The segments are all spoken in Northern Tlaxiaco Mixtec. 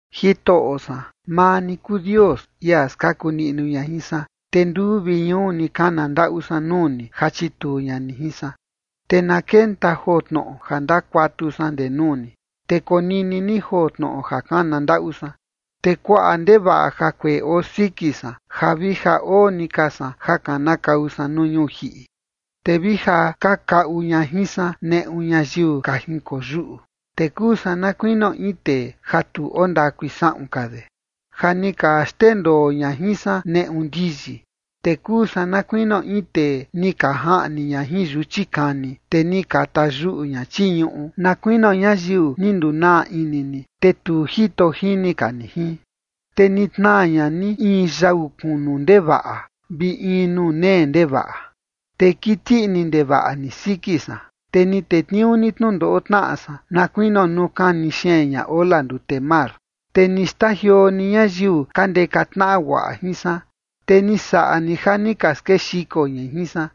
Jitoꞌo san, maa ni kuu Dios, ia skaku niꞌnu ña jin san, te nduu vi ñuu ni kana ndaꞌu san nuu ni ja chituu ña ni jin san. Te na kenta joo tnoꞌo ja ndakuatu san ndee nuu ni, te konini ni joo tnoꞌo ja kana ndaꞌu san. Te kuaꞌa ndevaꞌa jakueꞌe oo siki san, ja vi ja oo ni ka san ja kanakau san nuu ñuu jiꞌi. Te vi ja ka kaꞌu ña jin san neꞌu ñayiu ka jinkoyuꞌu, te kuu san na kuinio in tee ja tu ondakui saꞌun ka de, ja ni ka xndendoo ña jin san neꞌu ndiyi. Te kuu san na kuinio in tee ni ka jaꞌni ña jin yuchi kani, te ni ka tayuꞌu ña chii ñuꞌu, na kuinio ñayiu ni ndunaa ini ni, te tu jito jini ka ni jin. Te ni tnaa ña ni in yau kunu ndevaꞌa, vi in nuu nee ndevaꞌa. Te kiti ini ndevaꞌa ni siki san, te ni tetniuu ni tnundoꞌo tnaꞌa san, na kuinio nuu kani xeen ña ola ndute mar. Te ni xtajioo ni ñayiu ka ndeka tnaꞌa guaꞌa jin san, te ni saꞌa ni ja ni ka skexiko ñai jin san,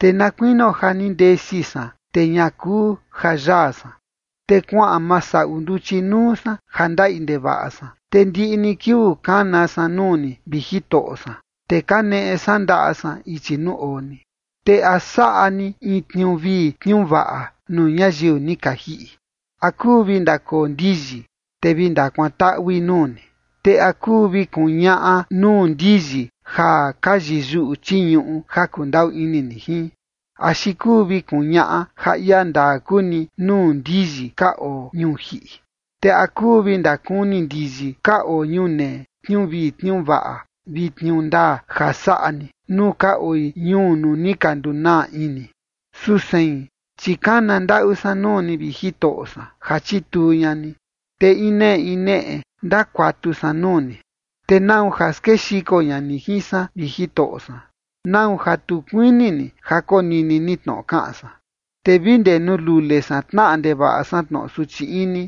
te na kuinio ja ni ndesi san, te ña kuu ja yaa san. Te kuaꞌan masaꞌu nduchi nuu san ja ndaꞌi ndevaꞌa san, te ndiꞌi ni kiuu kana san nuu ni, vi Jitoꞌo san, te kaneꞌe san ndaꞌa san ichi nuu oo ni. Te ¿a saꞌa ni in tniuu vii tniuu vaꞌa nuu ñayiu ni ka jiꞌi? ¿A kuu vi ndakoo ndiyi, te vi ndakuantaꞌui nuu ni? Te ¿a kuu vi kuñaꞌa nuu ndiyi ja ka yiyuꞌu chii ñuꞌu ja kundaꞌu ini ni jin? ¿Axi kuu vi kuñaꞌa ja ia ndaa kuu ni nuu ndiyi ka oo ñuu jiꞌi? ¿Te a kuu vi ndakuni ndiyi ka oo ñunee, tniuu vii tniuu vaꞌa vi tniuu ndaa ja saꞌa ni nuu ka oi ñuu nuu ni ka ndunaa ini? Su sein, chi kana ndaꞌu san nuu ni, vi Jitoꞌo san, ja chituu ña ni, te in neꞌe in neꞌe ndakuatu san nuu ni. Te ¿nau ja skexiko ña ni jin san, vi Jitoꞌo san? ¿Nau ja tu kuini ni ja konini ni tnoꞌo kaꞌan san? Te vi ndee nuu lule san tnaꞌa ndevaꞌa san tnoꞌo suchi ini,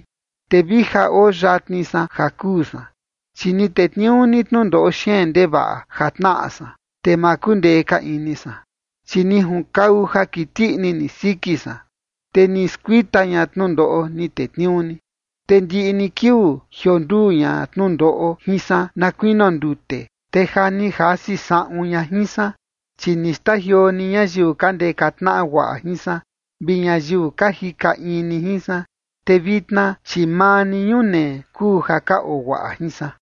te vi ja oo yatni san ja kuu san, chi ni tetniuu ni tnundoꞌo xeen ndevaꞌa ja tnaꞌa san, te ma kundee ka ini san. Chi ni junkau ja kiti ini ni siki san, te ni skuita ña tnundoꞌo ni tetniuu ni. Te ndiꞌi ni kiuu jionduu ña tnundoꞌo jin san na kuinio ndute, te ja ni jasi saꞌun ña jin san. Chi ni xtajioo ni ñayiu ka ndeka tnaꞌa guaꞌa jin san, vi ñayiu ka jika in ni jin san, te vitna, chi maa ni ñunee kuu ja ka oo guaꞌa jin san.